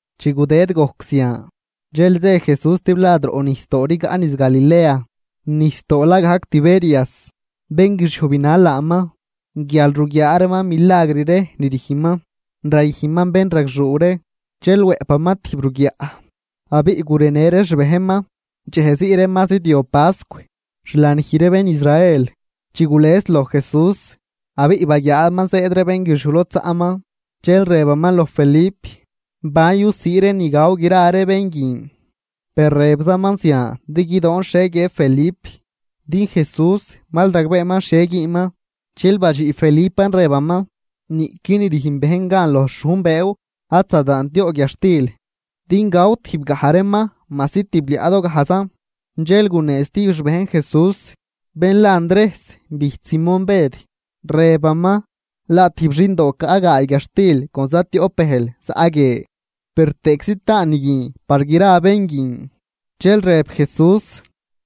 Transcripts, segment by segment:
Chi gudëd gojc zian, dxel zë Jesús stiblad roꞌnijsdoo rigaꞌ niz Galilea, nijsdoo la gajc Tiberias. Bénguixiuj binal laaman, guial ruguiaa reeman milagr ree ni rüjnman rayüjnman bénragxuu ree. Dxel wëꞌpaman tijb ruguiaꞌ abiꞌ gurenë ree xbejnman. Dxejzii ree ma zidyob pascw, xlanij ree bén Israel. Chi gules loj Jesús, abiꞌ baguiaaman zëëd ree bénguixiuj lod zaꞌman, dxel rëbaman loj Felip: ―¿Ban yusii ree ni gaw gra ree bén guin? Per rëbzaman zian din guidoon xhie guiëb Felip, din Jesús mal ragbeeman xhie güünman. Dxel badxiꞌ Felipan rëbaman: ―Niꞌqui ni rüjn bejn gan loj xhujn bëëw ad zadaant yoꞌ guiadxtil din gaw tijbgaj reeman majsi tibliaꞌdogajzan. Dxel gunee stijb xbejn Jesús, bén la Andrejs bijch Simón Bëd, rëbaman: ―Laa tijb xindo caꞌ gaay guiadxtil con zatioꞌp bëjl zaꞌ guie. Per, ¿tëꞌczi taan ni guin par gra bén guin? Dxel rëb Jesús: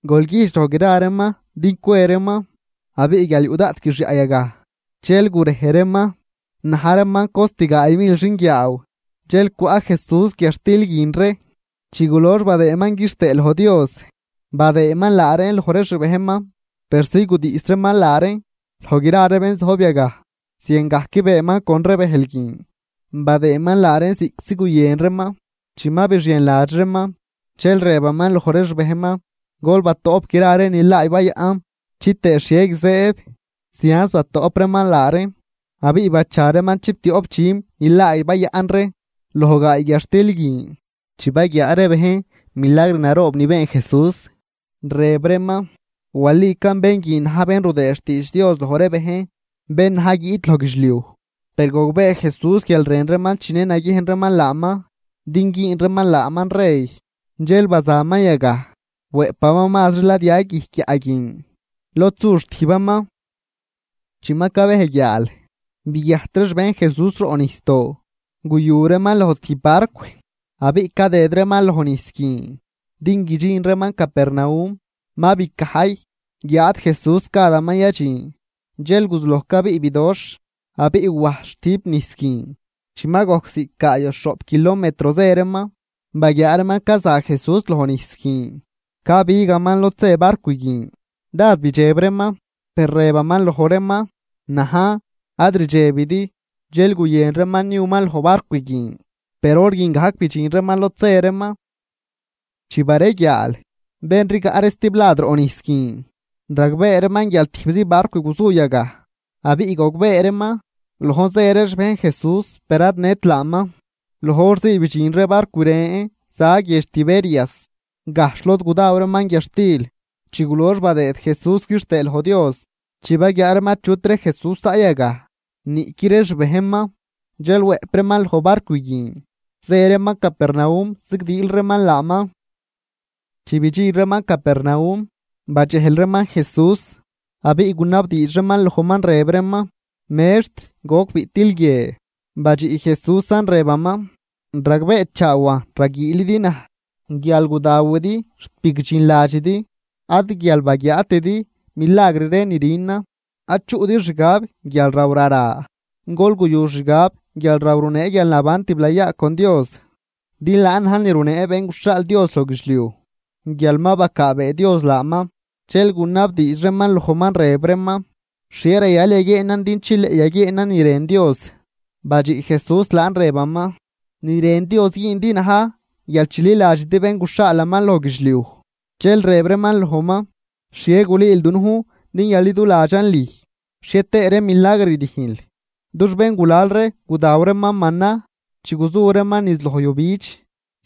―Gol güjdx loj gra reeman din cwe reeman. Abiꞌ guial yuꞌ daꞌt guixyaꞌ yagaj, dxel gurej reeman. Na̱j reeman cost gaay mil xinguiaaw. Dxel cwaꞌ Jesús guiadxtil guin ree. Chi gulox badëëman quixtëë loj Dios, badëëman laa reen loj ree xbejnman persi gudiꞌs reeman laa reen loj gra ree bén zojb yagaj. Ziangajc beenman con ree bëjl guin, badëëman laa reen ziꞌctzi guyën reeman. Chi ma bixienladx reeman, dxel rëbaman loj ree xbejnman: ―Gol batoꞌp gra ree ni laay bayaꞌn, chitëë xhie guizëëb. Zianz batoꞌp reeman laa reen, abiꞌ bacha reeman chiptioꞌp dxüm nilaay bayaꞌn ree loj gaay guiadxtil guin. Chi baguiaa ree bejn milagr naroob ni been Jesús, rëb reeman: ―Walican bén guin na̱j bén rudëë xtiidx Dios loj ree bejn, bén na̱j guiꞌt loj guidxliuj. Per gogbee Jesús guial rën reeman chinë naguiejn reeman laaman din güün reeman laaman rey, dxel bazaman yagaj, wëꞌpaman mazri ladya guijc guiaꞌ guin, lod su xtijbaman. Chi ma cabej guiaal, biguiajt ree xbejn Jesús roꞌnijsdoo, guyu reeman loj tijb barcw, abiꞌ cadëd reeman loj nijs guin din guidxin reeman Capernaum. Ma bicajy, guiáad Jesús gadaman yadxin. Dxel guzuloj cabiꞌ bidoxh abiꞌ wajs xtüjp nijs guin. Chi ma gojc ziꞌc gaay o xhoꞌp kilometro zë reeman, baguiaa reeman caza Jesús lojnijs guin cabigaman lod zë barcw guin, dád bidxeb reeman. Per rëbaman loj reeman: ―¡Najn, ad rdxebidi! Dxel guyën reeman niuman loj barcw guin, per hor guin gajc bidxin reeman lod zë reeman. Chi bareguiaal, bén rigaꞌ ree stiblad roꞌ nijs guin, ragbee reeman guial tijbzi barcw guzu yagaj, abiꞌ gogbee reeman, lojn zë ree xbejn Jesús per ad nët laaman. Loj hor zii bidxin ree barcw ren za guiedx Tiberias, gajxh lod gudaw reeman guiadxtil chi gulox badëëd Jesús quixtëë loj Dios. Chi baguiaa reeman achutri Jesús zaꞌ yagaj niꞌqui ree xbejnman, dxel wëꞌp reeman loj ree barcw guin, zë reeman Capernaum zigdiil reeman laaman. Chi bidxin reeman Capernaum, badxejl reeman Jesús, abiꞌ gunabdiidx reeman lojman, rëb reeman: ―Mextr, ¿goc biꞌtil guie? Badxiꞌ Jesúsan rëbaman: ―Ragbeechaawan, raguiilidi naj guial gudawidi xt bigdxinladxidi, ad guial baguiaatidi milagr ree ni rünan. Ad chuꞌdi xgab guialraw rara, gol guyu xgab guialraw runee guialnaban tiblayaa con Dios. Din laan na̱j ni runee Bén guxhaal Dios loj guidxliuj guial ma bacaabee Dios laaman. Dxel gunabdiidx reeman lojman rëb reeman: ―¿Xhie rayal yaguieenan din chileꞌ yaguieenan ni rën Dios? Badxiꞌ Jesús laan rëbaman: ―Ni rën Dios güündi na̱j guial chililadxidi bén guxhaalaman loj guidxliuj. Dxel rëb reeman lojman: ―¿Xhie gulüül dunujn din yaliduladxan lüj? ¿Xhietëë ree milagr rüjnl? Dux béngulal ree gudaw reeman mana chi guzu reeman niz loj yujbidx,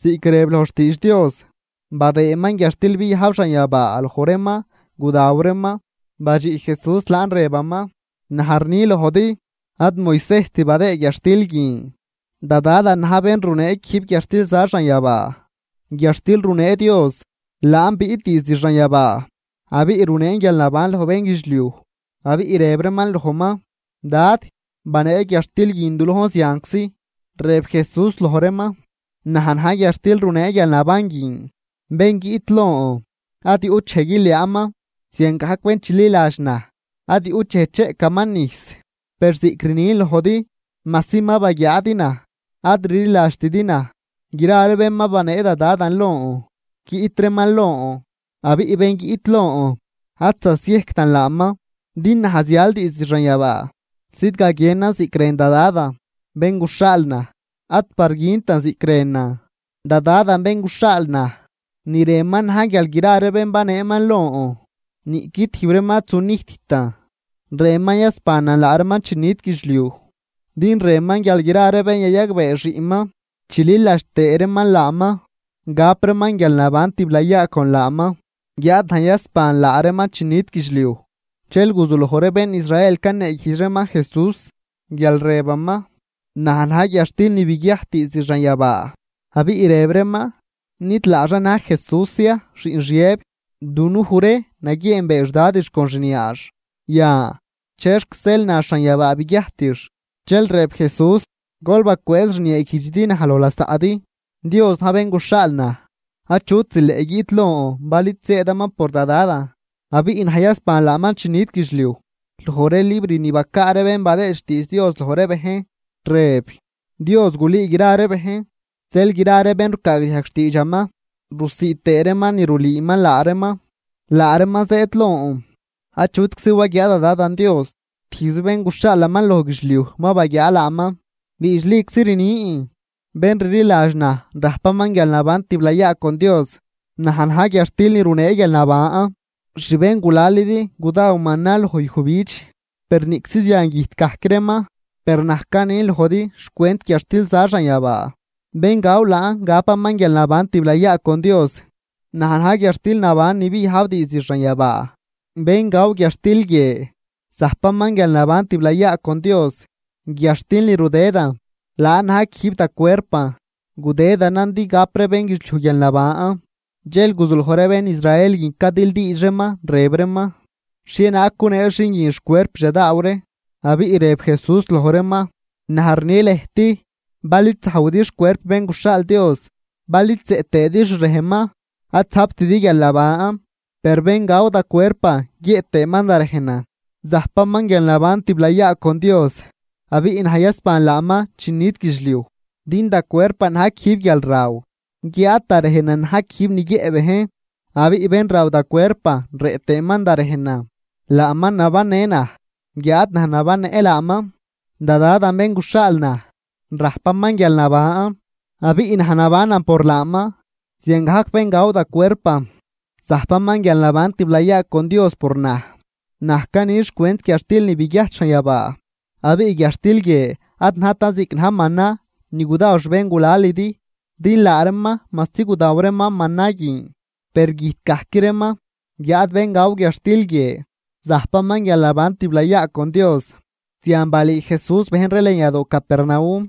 ziꞌc rëb loj xtiidx Dios: “Badëëman guiadxtil biajb xanyabaa loj reeman gudaw reeman.” Badxiꞌ Jesús laan rëbaman: ―Naj rni lojdi: Ad Moisejst badëëd guiadxtil guin, da Dadan na̱j bén runee quijb guiadxtil za xanyabaa. Guiadxtil runee Dios, laan biꞌt diizd xanyabaa abiꞌ runeen guialnaban loj bénguidxliuj. Abiꞌ rëb reeman lojman: ―Dad, banee guiadxtil guin du lojn zianczi. Rëb Jesús loj reeman: ―Naj na̱j guiadxtil runee guialnaban guin. Bén guiꞌt lon, ad yuꞌt dxej guiliaanman, ziangajc bén chililadx naj, ad yuꞌt dxej cheꞌcaman nijs. Per ziꞌc rnin lojdi, majsi ma baguiaadi naj, ad rliladxtidi naj. Gra ree bén ma banee da Dadan lon, guiꞌt reeman lon, abiꞌ bén guiꞌt lon, ad zasiejctan laaman. Din naj zial diizd xanyabaa, zidgaguienan ziꞌc rën da Dadan bén guxhaal naj, ad par güntan ziꞌc rënan. Da Dadan bén guxhaal naj, ni rënman na̱j guial gra ree bén baneeman lon niꞌqui tijb reeman ad zunijttan, rënman yasbanan laa reeman chi nit guidxliuj. Din rënman guial gra ree bén yayagbee Xiꞌnman chililadx tëë reeman laaman, gap reeman guialnaban tiblayaa con laaman, guiáad naj yasban laa reeman chi nit guidxliuj. Dxel guzuloj ree bén Israel caneeguijdx reeman Jesús, guial rëbaman: “Naj na̱j guiadxtil ni biguiajt diizd xanyabaa.” Abiꞌ rëb reeman: ―¿Nid laaxan na̱j Jesús ya, xiꞌn Xiëb? Dunuj ree naguieenbee xdadix con xniaax. Yan, ¿chexc zeel nax xanyabaa biguiajtix? Dxel rëb Jesús: ―Gol bacwëëz rnieeguijdxidi naj loj lasaꞌdi. Dios na̱j bén guxhaal naj. Achut zileꞌ guiꞌt lon bal id zëëdaman por da Dadan, abiꞌ naj yasban laaman chi nit guidxliuj. Loj ree libr ni bacaa ree bén badëë xtiidx Dios loj ree bejn, rëb: “Dios gulüü gra ree bejn.” Zeel gra ree bén rucaagdiajg xtiidxaman, rusiid tëë reeman ni rulüüman laa reeman, laa reeman zëëd lon. ’Achutczi waguiaa da Dadan Dios, tijbzi bén guxhaalaman loj guidxliuj ma baguiaa laaman. Diidxliczi rnin, bén rliladx naj rajpaman guialnaban tiblayaa con Dios. Naj na̱j guiadxtil ni runee guialnaban. Xbéngulalidi gudaw mana loj yujbidx, per niꞌczi zian güjt gajc reeman. Per naj canin lojdi xcwent guiadxtil za xanyabaa, bén gaw laan gapaman guialnaban tiblayaa con Dios. Naj na̱j guiadxtil naban ni biyajb diizd xanyabaa. Bén gaw guiadxtil guie zajpaman guialnaban tiblayaa con Dios. Guiadxtil ni rudëdan, laan na̱j quijb da cuerpan, gudëdanan din gap ree bénguidxliuj guialnaban. Dxel guzuloj ree bén Israel guin cadildiidx reeman, rëb reeman: ―¿Xhienaag gunee xin guin xcuerpix yadaaw ree? Abiꞌ rëb Jesús loj reeman: ―Naj rni lëjt, bal id zajwidi xcuerp Bén guxhaal Dios, bal id zëꞌ tëëdi xrejnman, ad zajptidi guialnaban. Per bén gaw da cuerpan guiëꞌ tëëman da rejnan, zajpaman guialnaban tiblayaa con Dios, abiꞌ naj yasban laaman chi nit guidxliuj. Din da cuerpan na̱j quijb guialraw, guiáad da rejnan na̱j quijb ni guiëꞌ bejn. Abiꞌ bén raw da cuerpan rëꞌ tëëman da rejnan, laaman nabannë naj, guiáad naj nabannëꞌ laaman. Da Dadan bén guxhaal naj, rajpaman guialnaban, abiꞌ naj nabanan por laaman. Ziangajc bén gaw da cuerpan, zajpaman guialnaban tiblayaa con Dios por naj. Naj cani xcwent guiadxtil ni biguiajt xanyabaa. Abiꞌ guiadxtil guie ad najtan ziꞌc na̱j mana ni gudaw xbéngulalidi, din laa reeman majsi gudaw reeman mana guin, per güjt gajc reeman. Guiáad bén gaw guiadxtil guie zajpaman guialnaban tiblayaa con Dios. Zian balüü Jesús bejn ree lën yadoo Capernaum.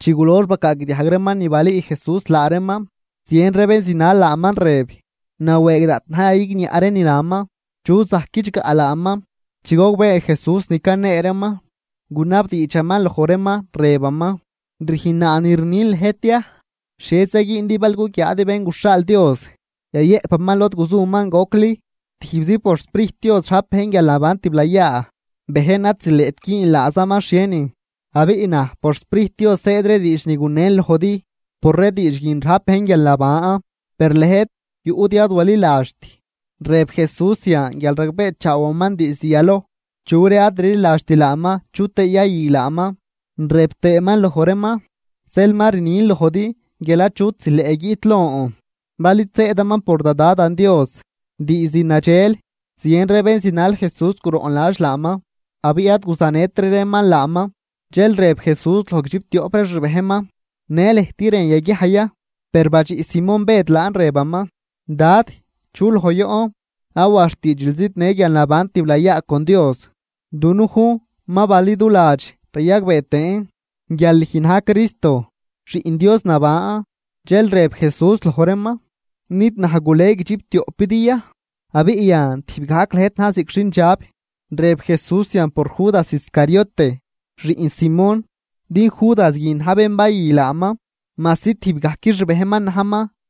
Chi gulox bacaagdiajg reeman ni balüü Jesús laa reeman, zien ree bén zinal laaman rëb: ―Nawëëg daꞌt na̱j yayigniaꞌ ree ni naman. ¿Chu zajc guidxgaꞌ laaman? Chi gogbee Jesús ni canee reeman, gunabdiidxaman loj reeman, rëbaman: ―¿Rüjnnaa ni rnin lëjt ya? ¿Xhieza güündi bal guguiaadi Bén guxhaal Dios yayëꞌpaman lod guzuman gocli? Tijbzi por xSprijt Dios rajp bejn guialnaban tiblayaa, bejn ad zileꞌt güün laazaman xhienin. Abiꞌ naj por xSprijt Dios zëëd ree diidx ni gunen lojdi, por ree diidx guin rajp bejn guialnaban. Per lëjt yuꞌdi ad waliladxt. Rëb Jesús zian guial ragbeechaawaman diizd yaloj chu ree ad rliladxt laaman chu tëë yayü laaman. Rëb tëëman loj reeman: ―Zeel ma rnin lojdi guial achut zileꞌ guiꞌt lon bal id zëëdaman por da Dadan Dios. Diizd nadxel, zien ree bén zinal Jesús guroꞌnladx laaman, abiꞌ ad guzanëtri reeman laaman. Dxel rëb Jesús loj guidxiptioꞌp ree xbejnman: ―¿Në lëjt rën yaguiaj ya? Per badxiꞌ Simón Bëd laan, rëbaman: ―Dad, ¿chu loj yoꞌn? Awa xtiidxil zidnë guialnaban tiblayaa con Dios. Dunujn ma baliduladx rayagbee tëën guial lüj na̱j Cristo, Xiꞌn Dios naban. Dxel rëb Jesús loj reeman: ―¿Nid naj gule guidxiptioꞌpidi ya? Abiꞌ yan tijb gajqui lëjt na̱j ziꞌc xindxab. Rëb Jesús zian por Judas Iscariote, xiꞌn Simón, din Judas guin na̱j bén bayü laaman, majsi tijb gajc xbejnman najman.